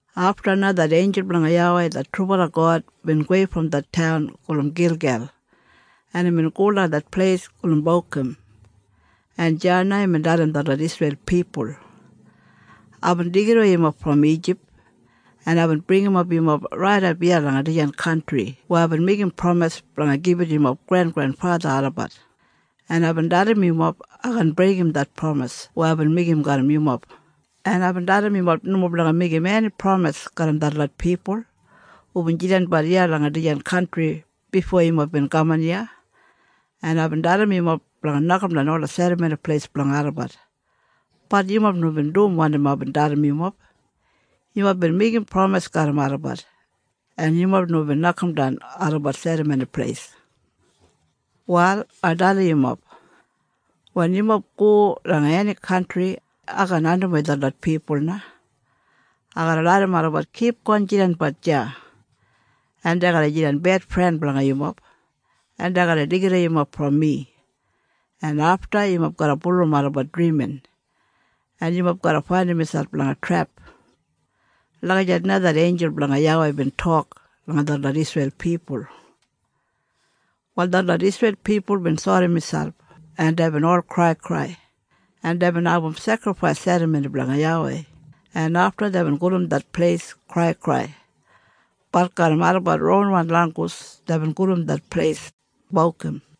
Afta na det einjul blanga YAWEI det trubala God bin gowei brom det taun gulum Gilgel, en imbin go langa det pleis gulum Bokim, en deya na imbin dalim detlot Isreil pipul, “Aibin deigidawei yumob brom Ijip, en aibin bringimap yumob raidap iya langa dijan kantri weya aibin meigim pramis blanga gibit yumob grengrenfatha olabat, en aibin dalim yumob ai kaan breigim det pramis weya aibin meigim garram yumob, en aibin dalim yumob nomo blanga meigim eni pramis garram detlot pipul hubin jidanbat iya langa dijan kantri bifo yumob bin kaman iya, en aibin dalim yumob blanga nokamdan ola serramoni pleis blanga olabat. Bat yumob nomo bin dum wanim aibin dalim yumob. Yumob bin meigim pramis garram olabat, en yumob nomo bin nokamdan olabat serramoni pleis. “Wal ai dalim yumob. Wen yumob go langa eni kantri, ai kaan andimwei detlot pipul na. Ai garra larram olabat kipgon jidanbat deya, en dei garra jidan bedfren blanga yumob, en dei garra deigidawei yumob brom mi, en afta yumob garra bulurrum olabat drimin, en yumob garra faindim miselp langa trep.” Lagijat na det einjul blanga YAWEI bin tok langa detlot Isreil pipul. Wal detlot Isreil pipul bin sori miselp, en deibin ol kraikrai, en deibin abum sekrifais serramoni blanga YAWEI, en afta deibin gulum det pleis Kraikrai. Bat garram olabat ronwan langgus deibin gulum det pleis Bokim.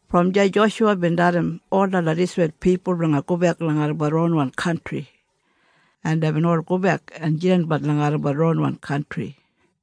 Brom deya Joshuwa bin dalim ol detlot Isreil pipul blanga gobek langa olabat ronwan kantri, en deibin ol gobek en jidanbat langa olabat ronwan kantri.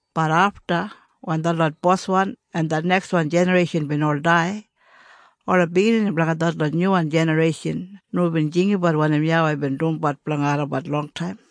Bat afta wen detlot boswan en det nekswan jinareishan bin ol dai, ola biginini blanga detlot nyuwan jinareishan nomo bin jinggabat wanim YAWEI bin dumbat blanga olabat longtaim.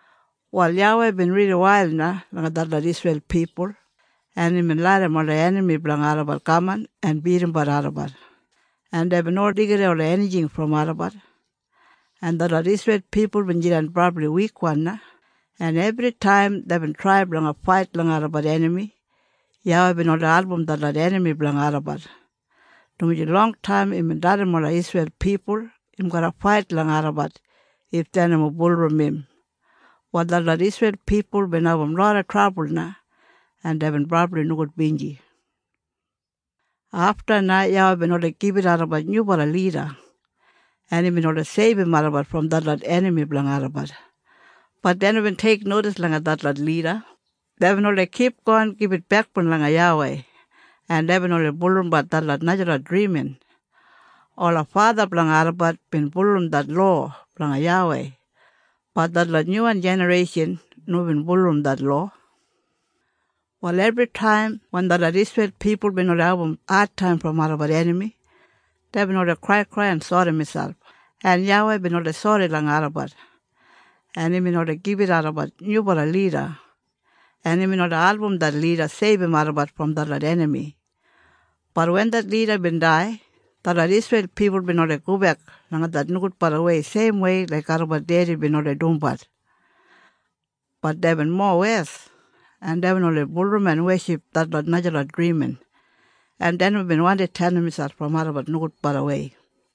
Wal YAWEI bin rili wail na langa detlot Isreil pipul, en imbin larram ola enami blanga olabat kaman en bidimbat olabat, en deibin oldei deigidawei ola enijing brom olabat, en detlot Isreil pipul bin jidan brabli wikwan na, en ebritaim deibin trai blanga fait langa olabat enami, YAWEI bin oldei album detlot enami blanga olabat, dumaji longtaim imbin dalim ola Isreil pipul im garra fait langa olabat if dei nomo bulurrum im. Wal detlot Isreil pipul bin abum loda trabul na, en deibin brabli nogudbinji. Afta na YAWEI bin oldei gibit olabat nyubala lida, en imbin oldei seibum olabat brom detlot enami blanga olabat. Bat dei nomo bin teiknodis langa detlot lida. Deibin oldei kipgon gibit bekboun langa YAWEI, en deibin oldei bulurrumbat detlot najalot drimin. Ola fatha blanga olabat bin bulurrum det lowa blanga YAWEI. Bat detlot nyuwan jinareishan nomo bin bulurrum det lowa. Wal ebritaim wen detlot Isreil pipul bin oldei abum adtaim brom olabat enami, deibin oldei kraikrai en sori miselp, en YAWEI bin oldei sori langa olabat, en imbin oldei gibit olabat nyubala lida, en imbin oldei album det lida seibum olabat brom detlot enami. Bat wen det lida bin dai, detlot Isreil pipul bin oldei gobek langa det nogudbalawei seimwei laik olabat dedi bin oldei dumbat. Bat deibin mowes, en deibin oldei bulurrum en weship detlot najalot drimin, en dei nomo bin wandi tenim miselp brom olabat nogudbalawei.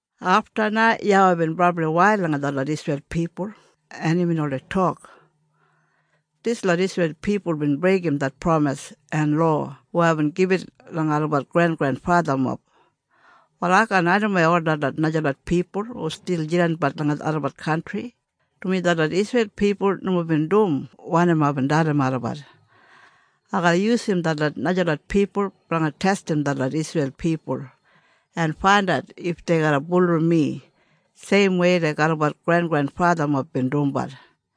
Afta na YAWEI bin brabli wail langa detlot Isreil pipul, en imbin oldei tok, “Dislot Isreil pipul bin breigim det pramis en lowa weya aibin gibit langa olabat grengrenfathamob. Wal ai kaan andimwei ol detlot najalot pipul hu stil jidanbat langa olabat kantri, dumaji detlot Isreil pipul nomo bin dum wanim aibin dalim olabat. Ai garra yusum detlot najalot pipul blanga testim detlot Isreil pipul en faindat if dei garra bulurrum mi seimwei laik olabat grengrenfathamob bin dumbat.”